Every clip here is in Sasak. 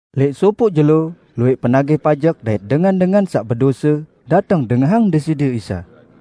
Lẽq sopoq jelo, luwẽq penagih pajek dait dengan-dengan saq bedose, dateng dengahang Deside Isa.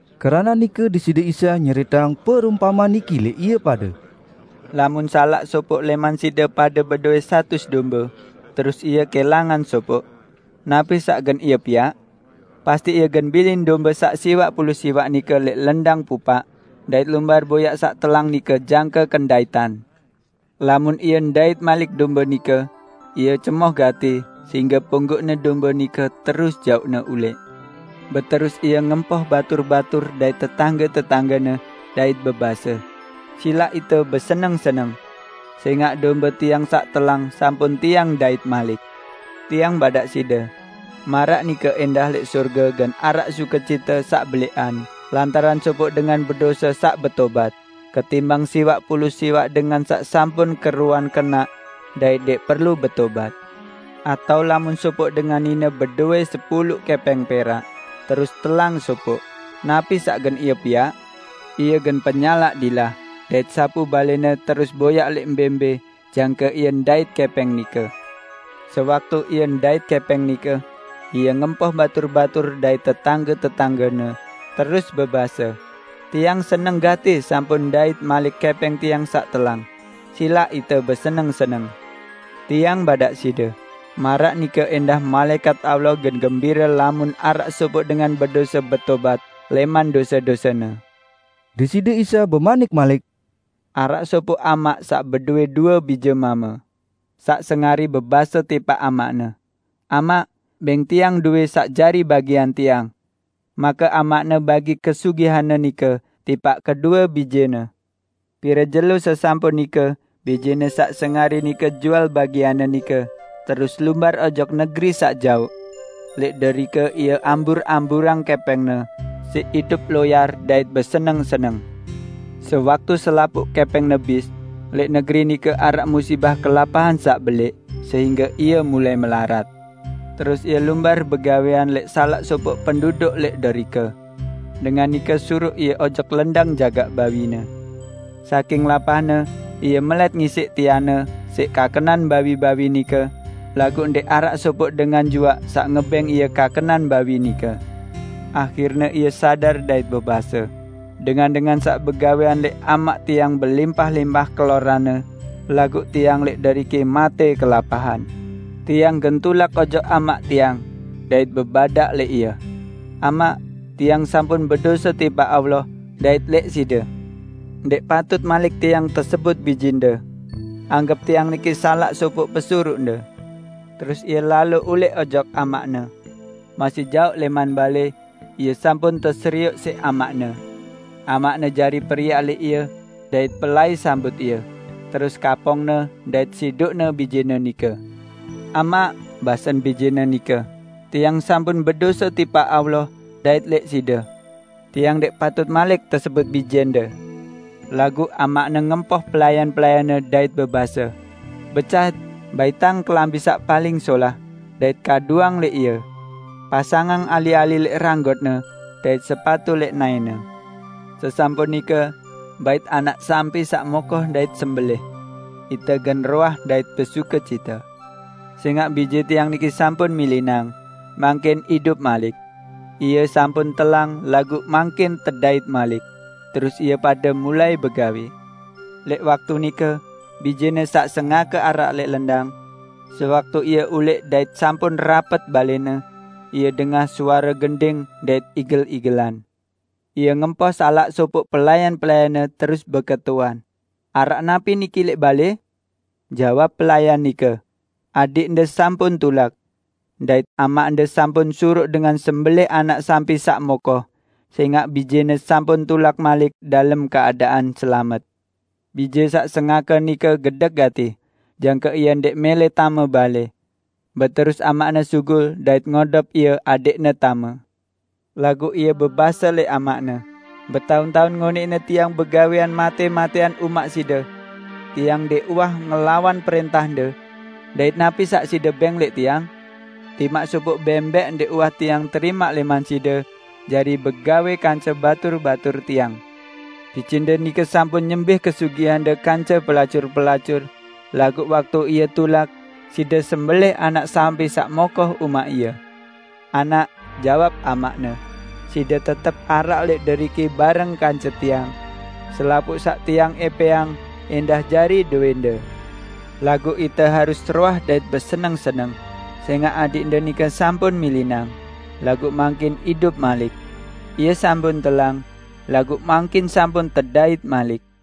Keranaq nike Deside Isa nyeriteang perumpamean niki lẽq ie pade, "Lamun salaq sopoq lẽman side pade bedowẽ satus dombe, terus ie kẽlangan sopoq -- napi saq gen ie piaq? Pasti ie gen bilin dombe saq siwaq pulu siwaq nike lẽq lendang pupaq, dait lumbar boyaq saq telang nike jangke kendaitan. Lamun ie ndait malik dombe nike, ie cemoh gati sehingge ponggoqne dombe nike, terus jauqne ulẽq. Beterus ie ngempoh batur-batur dait tetangge-tetanggene, dait bebase, 'Silaq ite beseneng-seneng. Sẽngaq dombe tiang saq telang sampun tiang ndait malik!' Tiang badaq side, maraq nike ẽndah lẽq sorge gen araq sukecite saq belẽqan lantaran sopoq dengan bedose saq betobat, ketimbang siwaq pulu siwaq dengan saq sampun keruan kenaq dait ndẽq perlu betobat." "Atao lamun sopoq dengan nine bedowẽ sepulu kẽpẽng perak, terus telang sopoq -- napi saq gen ie piaq? Ie gen penyalaq dilah dait sapu balẽne terus boyaq lẽq mbẽ-mbẽ jangke ie ndait kẽpẽng nike. Sewaktu ie ndait kẽpẽng nike, ie ngempoh batur-batur dait tetangge-tetanggene, terus bebase, 'Tiang seneng gati sampun ndait malik kẽpẽng tiang saq telang. Silaq ite beseneng-seneng!' Tiang badaq side, maraq nike ẽndah malaẽkat Allah gen gembire lamun araq sopoq dengan bedose betobat lẽman dose-dosene." Deside Isa bemanik malik, "Araq sopoq amaq saq bedowẽ due bije mame. Saq sengari bebase tipaq amaqne, 'Amaq, bẽng tiang dowẽ saq jari bagian tiang.' Make amaqne bagi kesugihanne nike tipaq kedue bijene. Pire jelo sesampun nike bijene saq sengari nike jual bagianne nike terus lumbar ojok negeri saq jaoq. Lẽq derike ie ambur-amburang kẽpẽngne siq idup loyar dait beseneng-seneng. Sewaktu selapuq kẽpẽngne bis, lẽq negeri nike araq musibah kelapahan saq belẽq, sehingge ie mulai melarat. Terus ie lumbar begawẽan lẽq salaq sopoq penduduk lẽq derike. Dengan nike suruq ie ojok lendang jagaq bawine. Saking lapahne ie melẽt ngisiq tianne siq kakenan bawi-bawi nike laguq ndẽq araq sopoq dengan juaq saq ngebẽng ie kakenan bawi nike. Ahirne ie sadar dait bebase, 'Dengan-dengan saq begawẽan lẽq amaq tiang belimpah-limpah keloranne, dait tiang lẽq deriki matẽ kelapahan! Tiang gen tulak ojok amaq tiang, dait bebadaq lẽq ie: Amaq, tiang sampun bedose tipaq Allah dait lẽq side. Ndẽq patut malik tiang tesebut bijende. Anggep tiang niki salaq sopoq pesuruqde.' Terus ie lalo ulẽq ojok amaqne. Masih jaoq lẽman balẽ, ie sampun teserioq siq amaqne. Amaqne jari periak lẽq ie dait pelai sambut ie, terus kapongne dait sidukne bijene nike. 'Amaq,' basen bijene nike, 'tiang sampun bedose tipaq Allah dait lẽq side. Tiang ndẽq patut malik tesebut bijende.' Laguq amaqne ngempoh pelayan-pelayanne, dait bebase, 'Becat! Baitang kelambi saq paling solah, dait kaduang lẽq ie. Pasangang ali-ali lẽq ranggotne dait sepatu lẽq naẽne. Sesampun nike bait anak sampi saq mokoh dait sembelẽh. Ite gen roah dait besukecite. Sẽngaq bije tiang niki sampun milinang, mangkin idup malik; ie sampun telang laguq mangkin tedait malik.' Terus ie pade mulai begawẽ. Lẽq waktu nike, bijene saq sengake araq lẽq lendang. Sewaktu ie ulẽq dait sampun rapet balẽne, ie dengah suare gending dait igel-igelan. Ie ngempoh salaq sopoq pelayan-pelayanne, terus beketuan, 'Araq napi niki lẽq balẽ?' Jawab pelayan nike, 'Adiqde sampun tulak! Dait amaqde sampun suruq dengan sembelẽh anak sampi saq mokoh, sẽngaq bijene sampun tulak malik dalem keadaan selamet!' Bije saq sengake nike gedek gati, jangke ie ndẽq mẽlẽ tame balẽ. Beterus amaqne sugul dait ngodop ie adẽqne tame. Laguq ie bebase lẽq amaqne, 'Betaun-taun ngonẽqne tiang begawẽan matẽ-matẽan umaq side. Tiang ndẽq uwah ngelawan prẽntahde. Dait napi saq side bẽng lẽq tiang? Timaq sopoq bẽmbẽq ndẽq uwah tiang terimaq lẽman side jari begawẽ kance batur-batur tiang! Bijende nike sampun nyembih kesugihande kance pelacur-pelacur, laguq waktu ie tulak, side sembelẽh anak sampi saq mokoh umaq ie!' 'Anak,' jawab amaqne, 'side tetep araq lẽq deriki bareng kance tiang. Selapuq saq tiang ẽpẽang ẽndah jari dowẽnde. Laguq ite harus roah dait beseneng-seneng, sẽngaq adiqde nike sampun milinang, laguq mangkin idup malik; ie sampun telang, laguq mangkin sampun tedait malik.' "